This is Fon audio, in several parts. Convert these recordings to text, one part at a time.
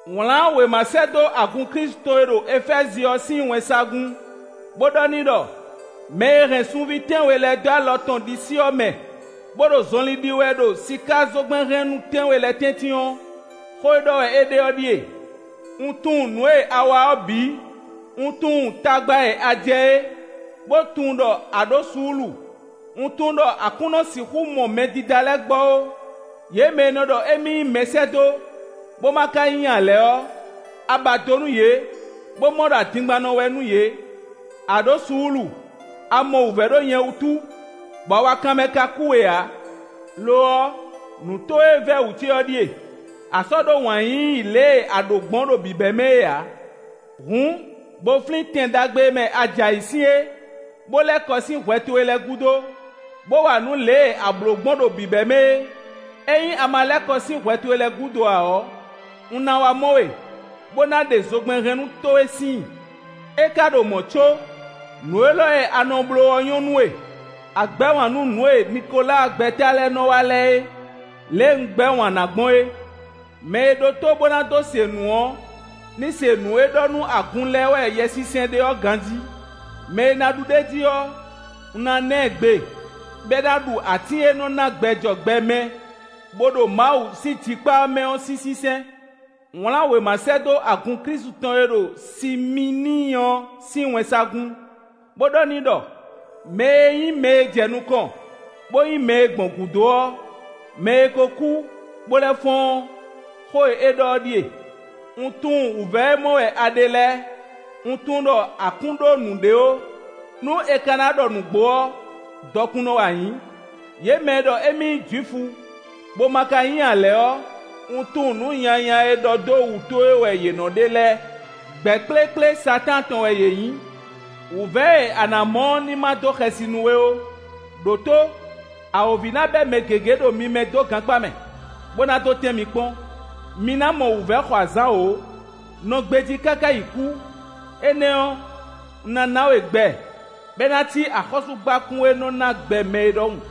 Wlǎn wěma sɛ́ dó agun Klísu tɔn e ɖo Efɛ́zi ɔ́ sín wɛnsagun, bó ɖɔ n'i ɖɔ: “Mɛ e hɛn sunví tɛ́nwe lɛ́ɛ dó alɔ tɔn ɖisí ɔ́ mɛ, bó ɖo zɔnlin ɖi wɛ ɖo sikázogbɛ́nhɛnnú tɛ́nwe lɛ́ɛ tɛ́ntin ɔ́, xó e ɖɔ wɛ é ɖe ɔ́ ɖíe: Un tunwun nǔ e a wa ɔ́ bǐ; un tunwun tagba e a jɛ é, bó tunwun ɖɔ a ɖǒ suúlu. Un tunwun ɖɔ a kún nɔ sixú mɔ mɛdídá lɛ́ɛ gbɔ ó; yě mɛ e nɔ ɖɔ émí nyí mɛsɛ́dó, bó ma ka nyí ǎ lɛ́ɛ ɔ́, a ba do nú yě, bó mɔ ɖɔ adingbannɔ wɛ nú yě. A ɖǒ suúlu; a mɔ wǔvɛ́ ɖó nyɛ wútu, bɔ awakanmɛ ka kú we ǎ. Lo ɔ́, nǔ towe e vɛ́ wǔ ce ɔ́ ɖíe: a sɔ́ ɖó wǎn yíyí lě e a ɖǒ gbɔn ɖo bǐbɛ́mɛ é ǎ. Hǔn, bó flín tɛn ɖagbe e mɛ a jɛ ayǐ sín é, bó lɛ́ kɔ sín hwɛ towe lɛ́ɛ gúdo, bó wa nǔ lě e a blǒ gbɔn ɖo bǐbɛ́mɛ é. Ényí a ma lɛ́ kɔ sín hwɛ towe lɛ́ɛ gúdo ǎ ɔ́, un ná wá mɔ we, bó na ɖe zogbɛ́nhɛnnú towe síin. É ka ɖo mɔ̌ có, nǔ élɔ́ e a nɔ bló ɔ́ nyɔ́ nú we: a gbɛ́ wǎn nú nǔ e Nikoláa gbɛ́ta lɛ́ɛ nɔ wa lɛ́ɛ é, lě e un gbɛ́ wǎn ná gbɔn é. “Mɛ e ɖó tó bó ná dó se nǔ ɔ́ ní se nǔ e ɖɔ nú agun lɛ́ɛ wɛ Yɛsinsɛn ɖe ɔ́ ganjí! “Mɛ e ná ɖu ɖ'é jí ɔ́, un ná ná ɛ gbe, bɔ é ná ɖu atín e nɔ ná gbɛ jɔ gbɛ mɛ, bó ɖo Mawu sín jikpá mɛ ɔ́ sín sínsɛ́n.” Wlǎn wěma sɛ́ dó agun Klísu tɔn e ɖo Simíini ɔ́ sín wɛnsagun, bó ɖɔ n'i ɖɔ: “Mɛ e nyí mɛ e jɛ nukɔn, bó nyí mɛ e gbɔn gǔdo ɔ́, mɛ e ko kú, bó lɛ́ fɔ́n ɔ́, xó e é ɖɔ ɔ́ ɖíe: Un tunwun wǔvɛ́ e mɔ wɛ a ɖe lɛ́ɛ; un tunwun ɖɔ a kún ɖó nǔɖé ó; nú è ka ná ɖɔ nǔgbó ɔ́, dɔkunnɔ wɛ a nyǐ! Yě mɛ e ɖɔ émí nyí Jwifu, bó ma ka nyí ǎ lɛ́ɛ ɔ́, un tunwun nǔ nyanya e ɖɔ dó wǔ towe wɛ yě nɔ ɖe lɛ́ɛ: gbɛ̌ kplékplé Satáan tɔn wɛ yě nyí! Wǔvɛ́ e a nǎ mɔ ɔ́ ní ma dó xɛsi nú we ó. Đǒtó: Awǒvi ná bɛ́ mɛ gěgé ɖo mi mɛ dó gankpá mɛ, bó ná dó tɛ́n mi kpɔ́n; mi ná mɔ wǔvɛ́ xɔ azǎn wǒ. Nɔ gbejí káká yi kú; énɛ́ ɔ́, un ná ná we gbɛ bɔ é ná cí axɔ́súgbákún e nɔ́ ná gbɛ mɛ é ɖɔhun.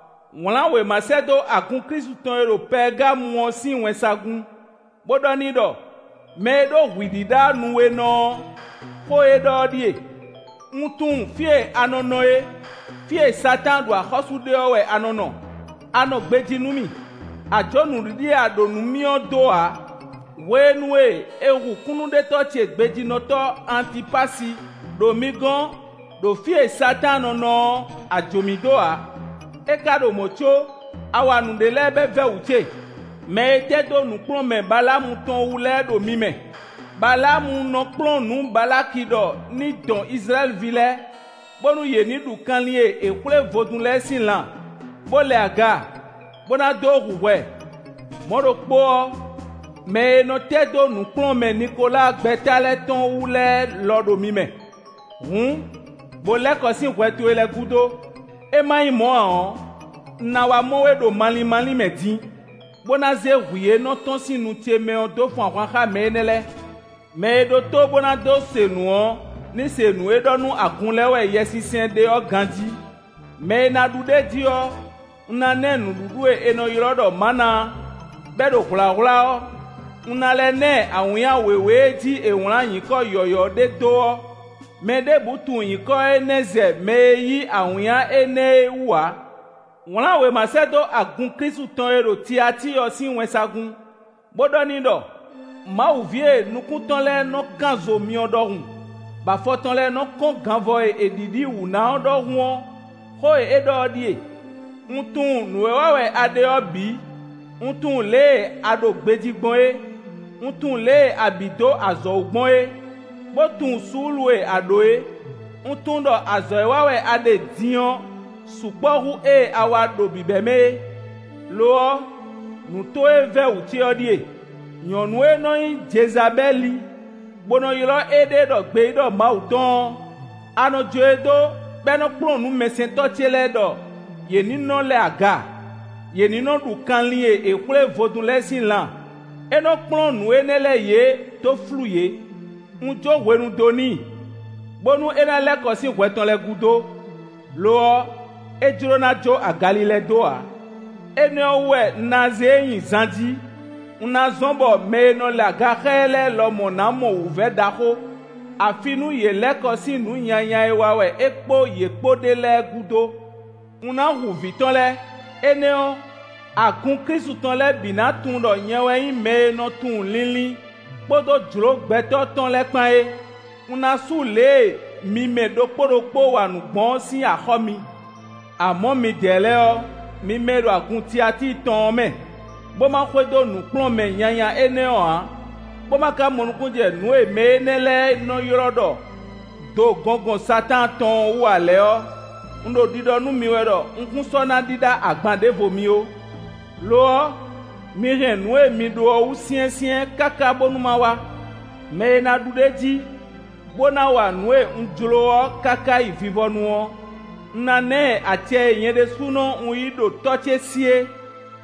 Wlǎn wěma sɛ́ dó agun Klísu tɔn e ɖo Pɛɛgamu ɔ́ sín wɛnsagun, bó ɖɔ n'i ɖɔ: “Mɛ e ɖó hwǐ ɖíɖá nu we nɔ ɔ́, xó e é ɖɔ ɔ́ ɖíe: Un tunwun fí e a nɔ nɔ é: fí e Satáan ɖu axɔ́sú ɖe ɔ́ wɛ a nɔ nɔ. A nɔ gbejí nú mì; a jǒ nǔɖiɖi e a ɖǒ nú mì ɔ́ dó ǎ; hwenu e è hu kúnnuɖetɔ́ ce gbejínɔtɔ́ Antipasi ɖo mi gɔ́n ɖo fí e Satáan nɔ nɔ ɔ́, a jǒ mì dó ǎ. É ka ɖo mɔ̌ có a wa nǔɖé lɛ́ɛ bɔ é vɛ́ wǔ ce: mɛ e tɛ́ dó nǔkplɔ́nmɛ Baláamu tɔn wú lɛ́ɛ ɖo mi mɛ: Baláamu nɔ kplɔ́n nǔ Balaki ɖɔ ní dɔn Izlayɛ́li ví lɛ́ɛ, bónú yě ní ɖu kanlin e è xwlé vodún lɛ́ɛ sín lan, bó lɛ aga, bó ná dó hu hwɛ. Mɔ̌ ɖokpó ɔ́, mɛ e nɔ tɛ́ dó nǔkplɔ́nmɛ Nikoláa gbɛ́ta lɛ́ɛ tɔn wú lɛ́ɛ lɔ ɖo mi mɛ. Hǔn, bo lɛ́ kɔ sín hwɛ towe lɛ́ɛ gúdo; é ma nyí mɔ̌ ǎ ɔ́, un ná wá mɔ we ɖo malín málín mɛ din, bó ná zé hwǐ e nɔ tɔ́n sín nu ce mɛ ɔ́ dó fun ahwan xá mɛ énɛ́ lɛ́ɛ. “Mɛ e ɖó tó bó ná dó se nǔ ɔ́ ní se nǔ e ɖɔ nú agun lɛ́ɛ wɛ Yɛsinsɛn ɖe ɔ́ ganjí! “Mɛ e ná ɖu ɖ'é jí ɔ́, un ná ná ɛ nǔɖuɖu e è nɔ ylɔ́ ɖɔ mǎna bɔ é ɖo hwlǎhwlá ɔ́. Un ná lɛ́ ná ɛ awǐnnya wěwé e jí è wlǎn nyǐkɔ yɔ̌yɔ́ ɖé dó ɔ́; mɛ ɖěbǔ tunwun nyǐkɔ énɛ́ zɛ mɛ e yí awǐnnya énɛ́ é wú ǎ.” Wlǎn wěma sɛ́ dó agun Klísu tɔn e ɖo Tiatíi ɔ́ sín wɛnsagun, bó ɖɔ n'i ɖɔ: “Mawu ví e nukún tɔn lɛ́ɛ nɔ kán zo myɔ ɖɔhun, bɔ afɔ tɔn lɛ́ɛ nɔ kɔ́n ganvɔ e è ɖiɖi wǔ ná ɔ́ ɖɔhun ɔ́, xó e é ɖɔ ɔ́ ɖíe: Un tunwun nǔ e wa wɛ a ɖe ɔ́ bǐ; un tunwun lě e a ɖo gbejí gbɔn é; un tunwun lě e a bǐ dó azɔ̌ wú gbɔn é, bó tunwun suúlu e a ɖǒ é. Un tunwun ɖɔ azɔ̌ e wa wɛ a ɖe din ɔ́ sukpɔ́ hú ée a wa ɖo bǐbɛ́mɛ é. Lo ɔ́, nǔ towe e vɛ́ wǔ ce ɔ́ ɖíe: nyɔ̌nu e nɔ nyí Jezabɛ́li bó nɔ ylɔ́ éɖée ɖɔ gbeyíɖɔ Mawu tɔn ɔ́, a nɔ jó e dó bɔ é nɔ kplɔ́n nǔ mɛsɛntɔ́ ce lɛ́ɛ ɖɔ yě ní nɔ́ lɛ aga; yě ní nɔ́ ɖu kanlin e è xwlé vodún lɛ́ɛ sín lan; é nɔ́ kplɔ́n nǔ énɛ́ lɛ́ɛ yě dó flú yě. Un jó hwenu dó n'i, bónú é ná lɛ́ kɔ sín hwɛ tɔn lɛ́ɛ gúdo; lo ɔ́, é jló ná jó agalilɛ dó ǎ. Énɛ́ ɔ́ wú wɛ un ná zé e nyi zan jí; un ná zɔ́n bɔ mɛ e nɔ lɛ aga xá ɛ lɛ́ɛ lɔ ná mɔ wǔvɛ́ ɖaxó, afi nú yě lɛ́ kɔ sín nǔ nyanya e wa wɛ é kpó yě kpó ɖe lɛ́ɛ gúdo. Un ná hu vǐ tɔn lɛ́ɛ; énɛ́ ɔ́, agun Klísu tɔn lɛ́ɛ bǐ ná tunwun ɖɔ nyɛ wɛ nyí mɛ e nɔ tunwun linlin kpódó jlǒ gbɛtɔ́ tɔn lɛ́ɛ kpán é. Un ná sú lě e mi mɛ ɖokpó ɖokpó wa nǔ gbɔn ɔ́ sín axɔ́ mi. “Amɔ̌ midɛɛ lɛ́ɛ ɔ́, mi mɛ e ɖo agun Tiatíi tɔn ɔ́ mɛ, bó ma xwedó nǔkplɔ́nmɛ nyanya énɛ́ ɔ́ ǎ, bó ma ka mɔ nukúnnú jɛ nǔ e mɛ énɛ́ lɛ́ɛ nɔ ylɔ́ ɖɔ ‘do gɔngɔn Satáan tɔn’ ɔ́ wú ǎ lɛ́ɛ ɔ́, un ɖo ɖiɖɔ nú mi wɛ ɖɔ un kún sɔ́ ná ɖíɖá agban ɖěvo mi ó. Lo ɔ́, mi hɛn nǔ e mi ɖó ɔ́ wú syɛ́nsyɛ́n káká bónú ma wá. “Mɛ e ná ɖu ɖ'é jí, bó ná wa nǔ e un jló ɔ́ káká yi vivɔnu ɔ́, un ná ná ɛ acɛ e nyɛ ɖésúnɔ un yí ɖo Tɔ́ ce sí é: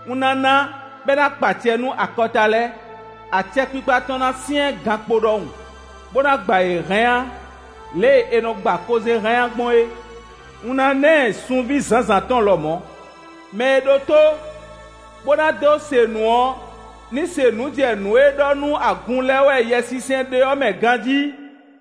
un ná ná bɔ é ná kpa acɛ nú akɔta lɛ́ɛ. Acɛkpikpa tɔn ná syɛ́n gankpo ɖɔhun, bó ná gba yě hánnyá lě e è nɔ gba kozɛ́n hánnyá gbɔn é. Un ná ná ɛ sunví zǎnzǎn tɔn lɔmɔ̌. “Mɛ e ɖó tó, bó ná dó se nǔ ɔ́ ní se nǔ jɛ nǔ e ɖɔ nú agun lɛ́ɛ wɛ Yɛsinsɛn ɖe ɔ́ mɛ ganjí!”